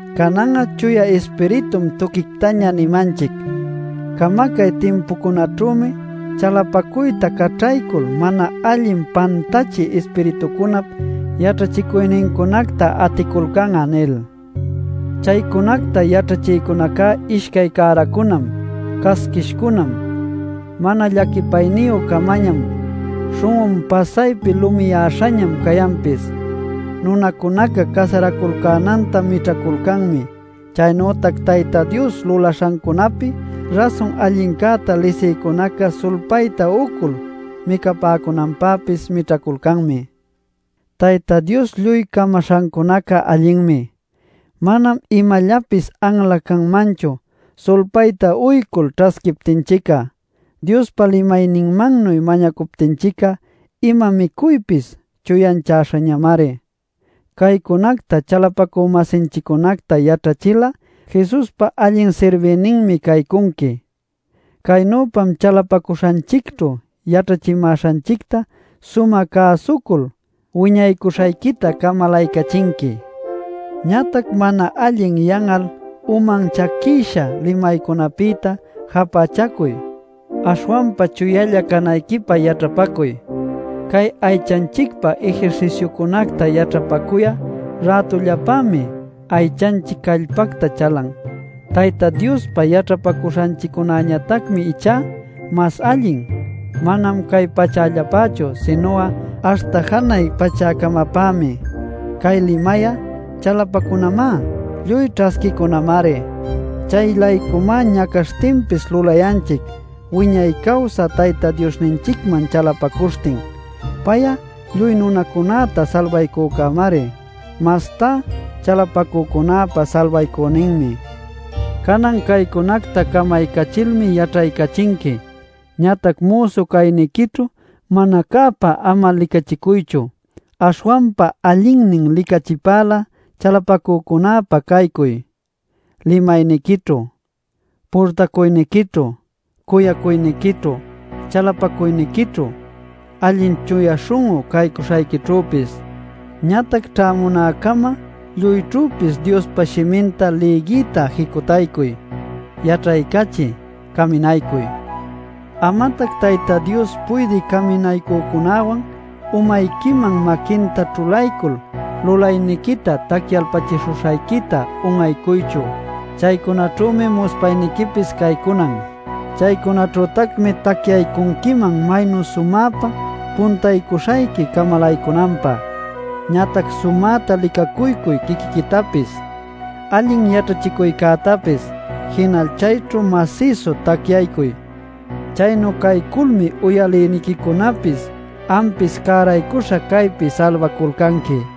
Canan'a Chuya Ispiritum tuquictaña nimanchic: “Camacay timpucunaćhümi chalapacuyta caćhaycul mana allin pantachï ispiritucunap yaćhachicuynincunacta aticulcan'a” nil. Chaycunacta yaćhachïcunaca ishcay cäracunam, casquishcunam, mana llaquipayniyü-camañam; śhun'un pasaypi lumiyäśhañam cayanpis. Nunacunaca casaraculcänanta mićhaculcanmi. Chaynütac Tayta Dios lulaśhancunäpi rasun allincäta lisïcunaca sulpayta uycul micapäcunanpäpis mićhaculcanmi. Tayta Dios lluy camaśhancunaca allinmi; manam imallapis anla canmanchu sulpayta uycul ćhasquiptinchic'a. Diospa limayninmannuy mañacuptinchic'a ima micuypis chuyanchäśhañamari. Caycunacta chalapacü-masinchiccunacta yaćhachil'a Jesuspa allin sirbïninmi caycunqui. Caynüpam chalapacuśhanchicćhu yaćhachimäśhanchicta sumä cäsucul wiñaycuśhayquita camalaycachinqui. Ñatac mana allin yan'al uman chaquïsha limaycunapïtá japächacuy; aśhwanpa chuyalla canayquipä yaćhapacuy. Cay aychanchicpä ejerciciocunacta yaćhapacuy'a rätullapämi aychanchic callpacta chalan. Tayta Diospä yaćhapacuśhanchiccäñatacmi ichá mas allin; manam cay pachällapächu sinu'a aśhta janay pachäcamapämi. Cay limay'a chalapacunamá, lluy ćhasquiycunamari. Chay-laycumá ñacaśhtinpis lulayanchic wiñay cawsä Tayta Diosninchicman chalapacuśhtin. Pay'a lluy nunacunäta salbaycücämari, mastá chalapacücunäpa salbaycüninmi. Canan caycunacta camaycachilmi yaćhaycachinqui. Ñatac müsu cayniquićhu mana-cäpa ama licachicuychu. Aśhwanpa allinnin licachipälä chalapacücunäpä caycuy: limayniquićhu, purtacuyniquićhu, cuyacuyniquićhu, chalapacuyniquićhu, allin chuya śhun'u caycuśhayquićhüpis. Ñatac ćhämunäcama lluyćhüpis Diospa Shiminta lïgiyta jicutaycuy, yaćhaycachiy, caminaycuy. Amatac Tayta Dios puydï caminaycücunäwan umayquiman maquinta ćhulaycul lulayniquita tacyalpachishuśhayquita un'aycuychu. Chaycunaćhümi muspayniquipis caycunan; chaycunaćhütacmi tacyaycunquiman maynu sumäpa puntaycuśhayqui camalaycunanpä. Ñatac sumäta licacuycuy quiquiquitapis allin yaćhachicuycätapis, jinal chayćhu masïsu tacyaycuy. Chaynu cayculmi uyalïniquicunapis ampis cäraycuśha caypi salbaculcanqui.